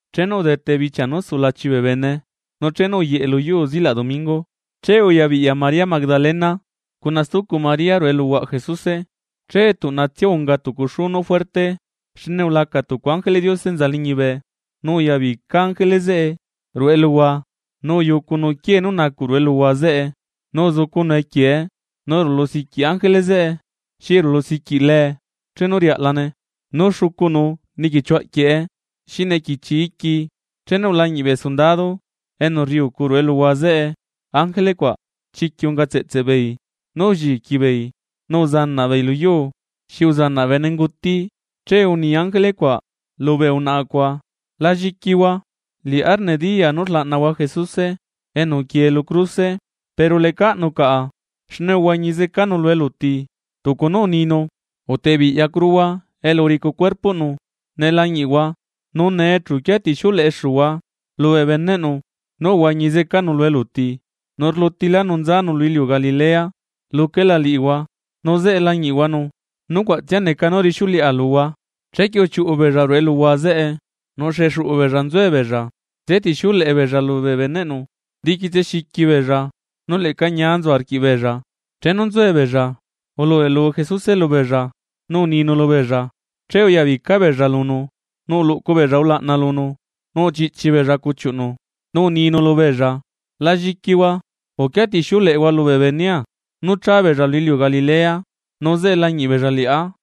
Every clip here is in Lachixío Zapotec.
Chenu udete bichia nú sulachi bee bene, nu chenu uyeꞌe lu yuu zilaꞌ domingo. Che uyabiꞌya María Magdalena cuna stucu María ruꞌu eluhuaꞌ Jesuse. Che tuꞌnatsia unga tucu xú nú juerte, xne ulaca tucu ángeleꞌ Diose enza liñibe nu uyabica ángele zeꞌe ruꞌu eluhua nu uyucunu quiee nú nacuꞌ ruꞌu eluhua zeꞌe, nu uzucunu equiee, nu rulu siquiꞌ ángele zeꞌe xi rulusiquiꞌ lee chenu riaꞌlane, nu xucunu niquichiu aꞌquieꞌe xi nequichi iqui. Chenu ulañiꞌ bee sundado enu rriucu ruꞌu eluhua zeꞌe ángele cuaꞌ, chiquiꞌ unga tseꞌtseꞌ beei nú ulliqui beei, nu uzanaꞌ beei lu yuu xi uzanaꞌ benenguti. Che uni ángele cuaꞌ lubee unaꞌa cuaꞌ: ―La lliquihua. Liꞌá nediyaa nú rlaꞌnahua Jesuse, enu uquie lu cruse. Pero lecaꞌnu caꞌa, xne uhuañi zecanu lu eluti tucu nú uninu. Utebiꞌyacuruhua elu uricu cuerpoꞌnu ne lañiꞌhua, nu nee chu uquia tixiuleꞌexuhua lubee beneꞌnu: “Nú uhuañi zecanu lu eluti, nu rlutilánu nzanu lu iliu Galilea, luquela liꞌihua nu zeꞌe lañiꞌhuanu.” Nucuaꞌtsia neca nú rixiuleꞌa luhua. Chequie uchiuꞌu beella ruꞌu eluhua zeꞌe, nu xexuꞌu beella nzuella nzetixiuleꞌe beella lubee beneꞌnu. Diquitse xiqui beella nu leꞌca ñia nzu arquiꞌbeella. Chenu nzuebeella ulubeꞌlu Jesuse lubeella inziu nu uninu lubeella. Che uyabica beella lunu nu uluꞌcu beella ulaꞌna lunu, nu uchiꞌchi beella cuchiuꞌnu, nu uninu lubeella: ―La lliquihua. Uquia tixiuleꞌehua lubee benea nú cha beella lu iliu Galilea, nu zeꞌe lañiꞌ beella liꞌá.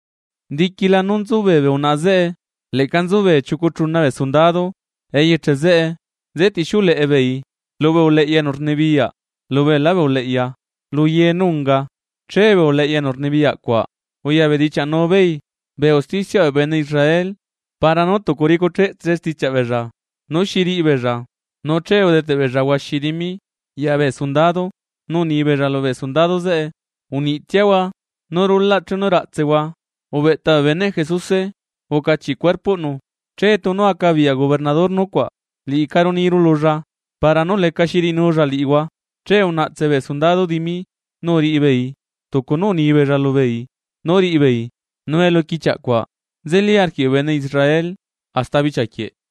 Diquila nú nzubee bee unaꞌa zeꞌe, leꞌca nzubee chiucu chuna bee sundado eyeche zeꞌe nzetixiuleꞌe beei lubee uleꞌya enu rnibiyaꞌ lubeelá bee uleꞌya luye nú unga. Che bee uleꞌya enu rnibiyaꞌ cuaꞌ uyabedichiaꞌnu beei bee usticiaꞌ bee bene Israel para nú tucu ricucheꞌtse stichiaꞌ beella, nú xi riꞌi beella nu che udeteꞌ beella huaxi dimi ya bee sundado, nu uni beella lubee sundado zeꞌe: ―Uniꞌtsiahua nú rulaꞌ chenu raꞌtsehua ubeꞌta bee beneꞌ Jesuse ucachiꞌ cuerpoꞌnu. Che tunu acabiyaꞌ gobernador nucuaꞌ, liꞌicaru niru lulla para nú lecaxi riꞌinulla liꞌihua. Che unaꞌtse bee sundado dimi, nu uriꞌi beei tucu nú unibeella lubeei nú riꞌi beei. Nu eluquichiaꞌ cuaꞌ nzeli arquiꞌ bee bene Israel hasta bichia quieꞌ.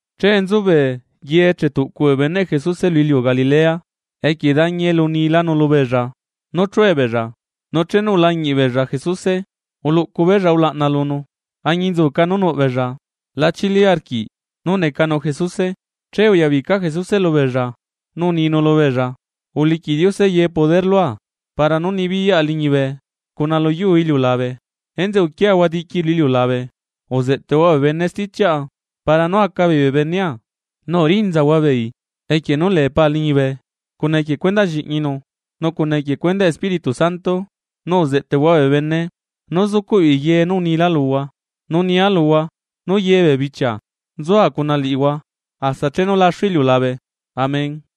Che nzubee ye chetuꞌcu bee beneꞌ Jesuse lu iliu Galilea, equie dañi elu unilanu lubeella nú chue beella. Nu chenu ulañiꞌ beella Jesuse uluꞌcu beella ulaꞌna lunu, añinzuca nú nuꞌ beella la chili arquiꞌ nú necanu Jesuse. Che uyabica Jesuse lubeella nu uninu lubeella: ―Uliquiꞌ Diose ye poder lua para nú nibiyaꞌa liñibe cuna luyuu iliulabe. Enzeꞌe uquiahua diqui lu iliulabe uzeꞌteꞌhua bee bene stichiaꞌa para nú aca beei bee benea. Nu urinzahua beei equie nú lee Pa liñibe, cuna equie cuendaꞌ lliꞌñinu nu cuna equie cuendaꞌ Espíritu Santo, nu uzeꞌteꞌhua bee bene nú zucuꞌ beei ye nú unilaa luhua. Nu nia luhua nú ye bee bichia nzua cuna liꞌihua, hasta chenu laxu iliulabe. Amén.